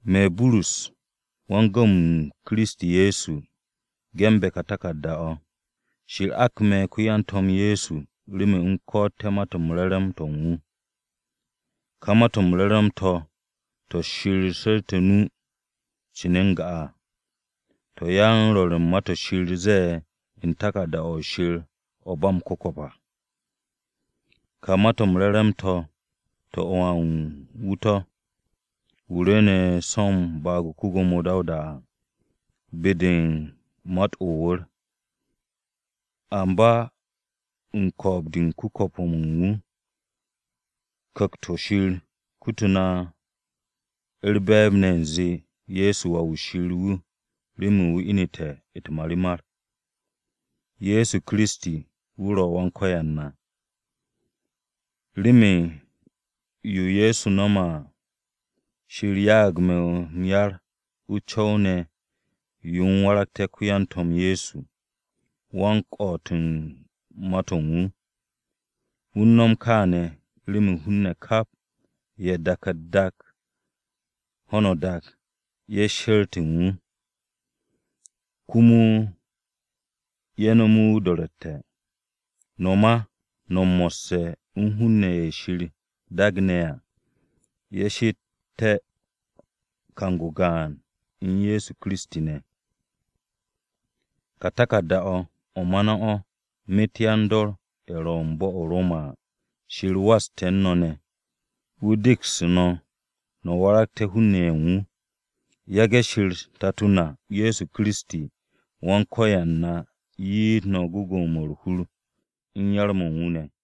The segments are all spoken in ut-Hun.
Me̱, Burus, wan-gu̱w-m Kiristi Ye̱so, ge̱nbe̱ ka taku̱rda-o̱. Shir ak me̱ ko-yan-To̱m Ye̱so remen u̱m ko̱'o̱tté̱ Ma-to̱ m-Re̱re̱m to̱ u̱n wu̱. Ka Ma-to̱ m-Re̱re̱m to̱, to̱ Shir su̱rte̱ o-nu cin n-ga à, to̱ yan-rwo̱r u̱n Ma-to̱ Shir ze̱e̱ u̱n Taku̱rda-o̱ Shir o̱ u̱n ba m-ku̱ko̱p à. Ka Ma-to̱ m-Re̱re̱m to̱, to̱ u̱n Wà u̱n wu̱ to̱, wu̱ rwu̱u̱ne̱ so̱ u̱n baag-o ko-Gwo̱mo Dawuda à, be-de u̱n mat-o̱ o-wu̱r. Amba u̱n ko̱o̱b-de u̱n ku̱ko̱p-mo̱ u̱n wu̱, Ku̱kt-o̱ Shir kututu̱ na u̱r-be̱e̱b ne̱ u̱nze, Ye̱so Wà-wu̱ Shir wu̱ remen wu̱ inu̱te̱ u̱t-marimar. Ye̱so Kiristi, wu̱ ro̱ Wan-Ko̱yan na. Remen yo Ye̱so nome̱ me̱ à, Shir ya'ag me̱ m-yar u̱n o-co̱w yo u̱m waragte̱ ko-yan-To̱m Ye̱so, wan-ko̱'o̱t u̱n Ma-to̱ u̱n wu̱. Wu̱ u̱n nom kaane̱ remen hun-ne̱ kap ye̱ u̱n dak-u̱t-dak, ho̱no o-dak ye̱ sheret u̱n wu̱, komo ye̱ nome̱ wu̱ o-do̱ro̱tte̱. No̱ ma, no̱ mo̱sse̱ u̱n hun-ne̱ ye̱ u̱n Shir daagne̱ à ye̱ she'ete̱ kang-o gaan u̱n Ye̱so Kiristi ne̱. Ka taku̱rda-o̱, o̱ ma no̱ o̱ myet yan-dor-ye̱ ro̱ u̱n bo̱-o̱ o-Roma à: Shir waste̱ u̱n no̱ ne̱. Wu̱ degsu̱ no̱, no̱ waragte̱ hun-ne̱ ye̱ u̱n wu̱. Me̱ u̱s-ko̱n Shir Tato na u̱n Ye̱so Kiristi, Wan-Ko̱yan na wu̱ 'ye no̱ gwu̱gwu̱-mo̱ u̱r-hur u̱n yar-mo̱ u̱n wu̱ ne̱.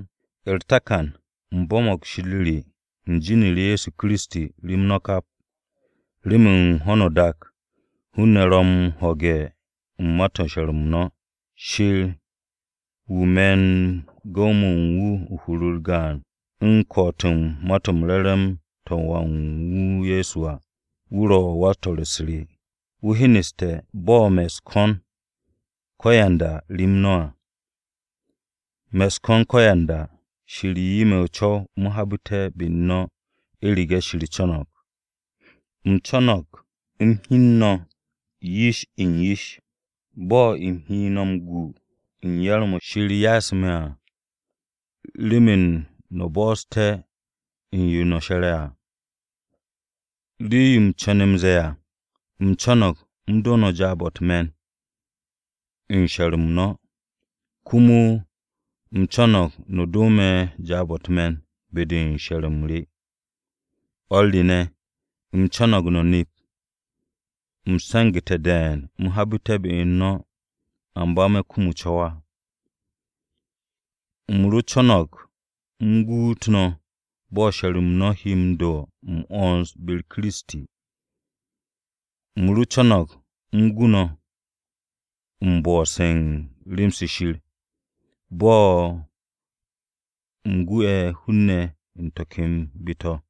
U̱r-takan, u̱m bo̱mo̱g Shir re u̱n jin-u̱r Ye̱so Kiristi rem no̱ kap, remen ho̱no o-dak hun-ne̱ ro̱ u̱n m-ho̱ge̱ u̱n ma-to̱ u̱n she̱r-m no̱. Shir, wu̱ me̱ u̱n gu̱w-mo̱ u̱n wu̱ u̱n hur-u̱r gaan u̱n ko̱'o̱t u̱n Ma-to̱ m-Re̱re̱m to̱ u̱n Wà u̱n wu̱ Ye̱so à, wu̱ ro̱ wan-swo̱-u̱s re, wu̱ hyeneste̱ bo̱ me̱ u̱s-ko̱n ko̱yanda rem no̱ à. Me̱ u̱s-ko̱n ko̱yanda, Shir 'ye me̱ o-co̱w u̱m habu̱te̱ be-u̱r no̱, u̱rege̱ Shir co̱no̱g. Me̱ u̱n re̱e̱b-o̱ u̱m hyenet no̱, bo̱ u̱m he no̱ m-gu u̱n yar-mo̱ Shir ya'asu̱ me̱ à, remen no̱ bo̱'o̱su̱té̱ u̱n yo no̱ she̱re̱ à. Rii-yo u̱m co̱ne̱ m-ze̱e̱ à, u̱m co̱no̱g u̱m do no̱ jaab-o̱ u̱t-me̱n u̱n she̱r-m no̱, komo u̱m co̱no̱g no̱ do me̱ jaab-o̱ u̱t-me̱n be-de u̱n she̱r-m re. O̱r re ne̱, u̱m co̱no̱g no̱ nep u̱m se̱ngu̱te̱ de̱e̱n u̱m habu̱te̱ be-u̱r no̱. Amba me̱ kum o-co̱w á. U̱m ro co̱no̱g u̱m guut no̱ bo̱ she̱r-m no̱ he m-do̱ m-'wo̱ns be-u̱r Kiristi à. U̱m ro co̱no̱g m-gu no̱, u̱m bo̱'o̱se̱ u̱n rem-se Shir, bo̱ u̱m gu'e̱ hun-ne̱ u̱n to̱ ken be-to̱ à.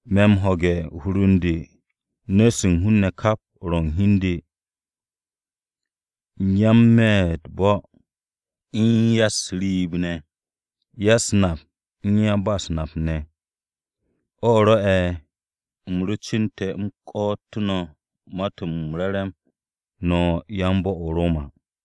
Me̱ m-ho̱ge̱ u̱n hur u̱n de nu̱-se u̱n hun-ne̱ kap ro̱ u̱n hi u̱n de, ya-n-me̱ u̱t-bo̱ u̱n ya-u̱s-riib ne̱, ya-u̱s-nap u̱n ya-ba-u̱s-nap ne̱. O̱ rwo̱'e̱ u̱m ro cu̱nte̱ m-ko̱'o̱tu̱ no̱ Ma-to̱ m-Re̱re̱m no̱ yan-bo̱-o̱ o-Roma.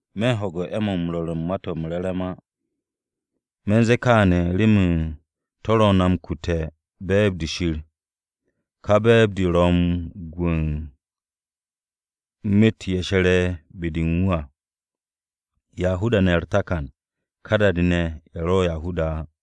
Me̱ u̱n ho̱ge̱ u̱n 'e̱-mo̱ u̱n rwo̱r u̱n Ma-to̱ m-Re̱re̱m á. Me̱ u̱n ze̱e̱ kaane̱ remen to̱ ro̱ na m-kute̱ u̱n be̱e̱b-de Shir. Ka be̱e̱b-de de ro̱ u̱n gwu̱-o̱ u̱n myet ye̱ she̱re̱ be-de u̱n wu̱ à, Yahuda-ne̱ u̱r-takan, ka da-de ye̱ ro̱ Yahuda-ne̱ á.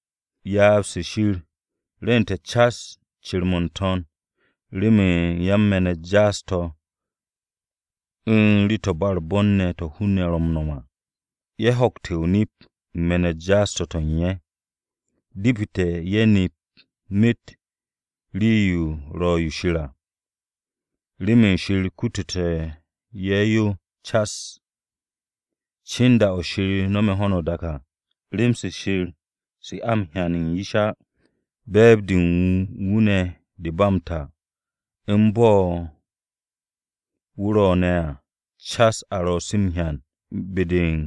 Ryaab-se Shir rwu̱nte̱ cas cir-mo̱ n-to̱n remen yan-me̱n-u̱t jaas-to̱ u̱n rii-to̱ u̱n ba u̱r-bon to̱ hun-ne̱ ro̱ m-no̱m ne̱ à. Ye̱ ho̱kte̱ o-nip u̱n me̱n-u̱t jaas-to̱ to̱ u̱n ye̱. Depete̱ ye̱ nep myet rii-yo ro̱ yo Shir à, remen Shir kututu̱ ye̱ yo cas. Cin da-o̱ Shir no̱me̱ ho̱no o-dak à, rem-se Shir, se a m-hyan u̱n yish á, be̱e̱b-de u̱n wu̱ de ba m-ta, u̱n bo̱ wu̱ ro̱ ne̱ à, cas a ro̱ se m-hyan be-de u̱n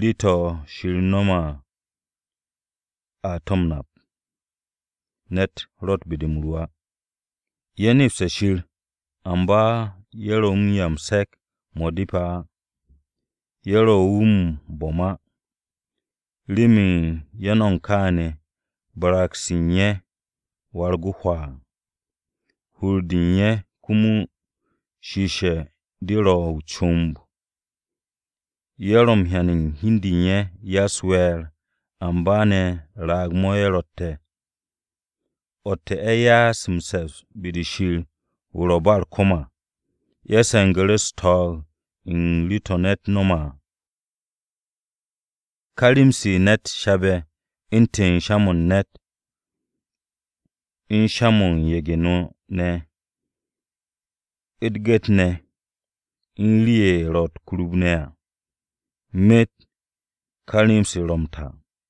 rii-to̱ Shir no̱me̱ à a to̱ m-nap. Ne̱t ro̱tt be-de m-ru á. Ye̱ nepste̱ Shir, amba ye̱ ro wu̱ m-'ya u̱n se̱k-mo̱ depe̱ á, ye̱ ro wu̱ m-bo̱m á. Remen ye̱ no̱mo̱g kaane̱, barag-se u̱n ye̱ warag o-hwaa, hur-de u̱n ye̱, komo shiishe̱ de rowe̱ o-comb. Ye̱ ro m-hyan u̱n hi u̱n de u̱n ye̱ ya-u̱s-we̱e̱r amba ne̱ raag-mo̱ ye̱ rotte̱. O̱tte̱ ye̱ ya'as m-se̱ps be-de Shir wu̱ u̱n ba u̱r-ko̱m à, ye̱ se̱ngu̱ru̱ u̱s-to̱o̱g u̱n rii-to̱ ne̱t no̱me̱ à. Ka rem-se ne̱t shabe̱ à, u̱ntu̱n sha-mo̱ u̱n ne̱t, u̱n sha-mo̱ u̱n ye̱ge̱-no ne̱, u̱t-gu̱t ne̱, u̱n rii-ye̱ ro̱ u̱t-kurub ne̱ à. Myet ka rem-se ro̱ m-ta.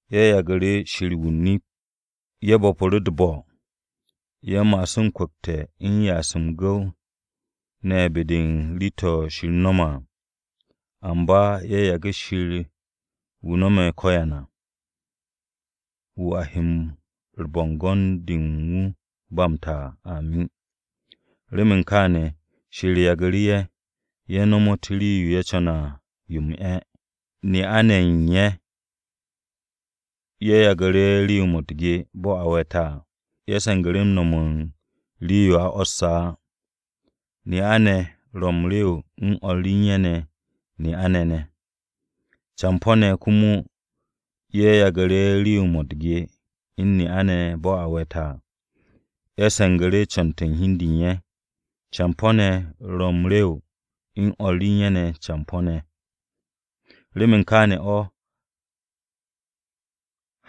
Ye̱ yagu̱ru̱ Shir wu̱ o-nip, ye̱ bo̱pu̱ru̱ u̱t-bo̱. Ye̱ ma'asu̱ m-kwu̱kte̱ u̱n ya'asu̱ m-gu̱w ne̱ be-de u̱n rii-to̱ Shir no̱me̱ à, amba ye̱ yage̱ Shir wu̱ no̱me̱ ko̱yan à, wu̱ a he u̱r-bo̱ngo̱n de u̱n ba m-ta à, amin. Remen kaane̱, Shir yagu̱ru̱ ye̱. Ye̱ nomot rii-yo ye̱ co̱ne̱ à yo m-'e̱. Ne'a-ne̱ ye̱ u̱n ye̱ yagu̱ru̱ rew-mo̱ u̱t-ge bo̱ a we̱te̱ à. Ye̱ se̱ngu̱ru̱ no̱m u̱n rii-yo a 'wo̱sse̱ á. Ne'a-ne̱ ro̱ m-rew u̱n o̱r u̱n ye̱ ne̱ ne'a-ne̱. Campo̱-ne̱ komo ye̱ yagu̱ru̱ rew-mo̱ u̱t-ge u̱n ne'a-ne̱ ne̱ bo̱ a we̱te̱ à. Ye̱ se̱ngu̱ru̱ co̱n-to̱ u̱n hi u̱n de u̱n ye̱, campo̱-ne̱ ro̱ m-rew u̱n o̱r u̱n ye̱ ne̱ campo̱-ne̱. Remen kaane̱ o̱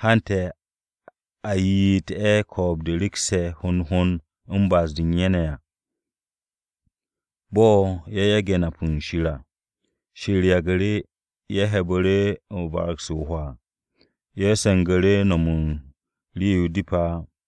hante̱ a ye'et ye̱ u̱r-ko̱o̱b de rekse̱ hond hond u̱n ba'as-de u̱n ye̱ ne̱ à. Bo̱ ye̱ yage̱ nap u̱n Shir à, Shir yagu̱ru̱ ye̱, ye̱ he̱'e̱bu̱ru̱ u̱n barag-se o-hwaa, ye̱ se̱ngu̱te̱ no̱m u̱n rii-yo depe̱ á.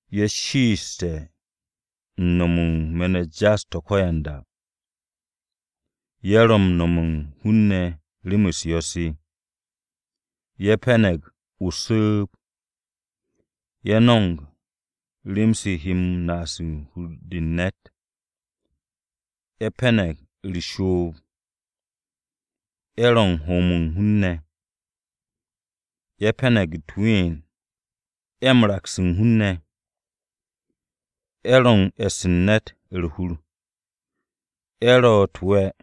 Ye̱ shiishe̱ u̱n no̱m u̱n me̱n-u̱t jaas-to̱ ko̱yanda. Ye̱ ro̱ u̱n nome̱ hun-ne̱ rem-u̱s yo̱-se. Ye̱ pe̱ne̱g o-su̱u̱b. Ye̱ m-no̱m u̱n rem-se he naas u̱n hur-de u̱n ne̱t à. Ye̱ pe̱ne̱g u̱r-shoob. Ye̱ ro̱ u̱n hoom u̱n hun-ne̱. Ye̱ pe̱ne̱g u̱t-ween. Ye̱ m-raks u̱n hun-ne̱. Ye̱ ro̱ u̱n e̱ss u̱n ne̱t u̱r-hur. Ye̱ ro̱ u̱t-we̱.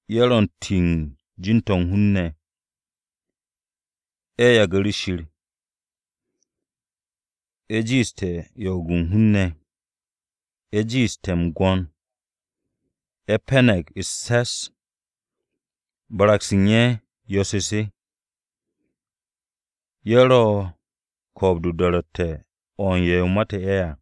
Ye̱ ro̱ u̱n m-ti u̱n jin-to̱ u̱n hun-ne̱. Ye̱ yagu̱ru̱ Shir. Ye̱ jiite̱ yo'og-o̱ u̱n hun-ne̱. Ye̱ jiite̱ m-gwo̱n. Ye̱ pe̱ne̱g u̱s-se̱s. Barag-se u̱n ye̱ yo̱-se se. Ye̱ ro̱ u̱n ko̱o̱b-de o-do̱ro̱tte̱ o̱ u̱n ye̱ mate̱ ye̱ à.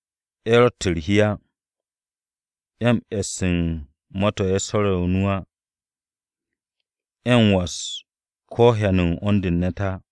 Ye̱ ro̱tt u̱r-hi á. Ye̱ m-shoos u̱n ma-to̱ ye̱ su̱rte̱ o-nu á. Ye̱ m-was ko̱ hyan u̱n 'wo̱n-de u̱n hun-ne̱ á.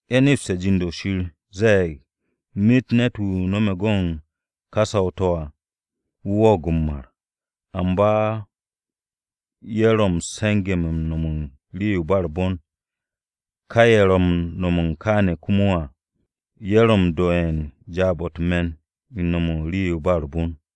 Ye̱ nepste̱ jind-o̱ Shir ze̱e̱g myet ne̱t-wu̱ no̱me̱ go̱n ka saw-to̱ à, wu̱ wo̱o̱g m-mar. Amba ye̱ ro̱ se̱nge̱-mo̱ u̱n no̱m u̱n rii-yo ba u̱r-bon, ka ye̱ ro̱ m-no̱m kaane̱ komo à, ye̱ ro̱ ye̱ m-do'e̱ jaab-o̱ u̱t-me̱n u̱n rii-yo ba u̱r-bon.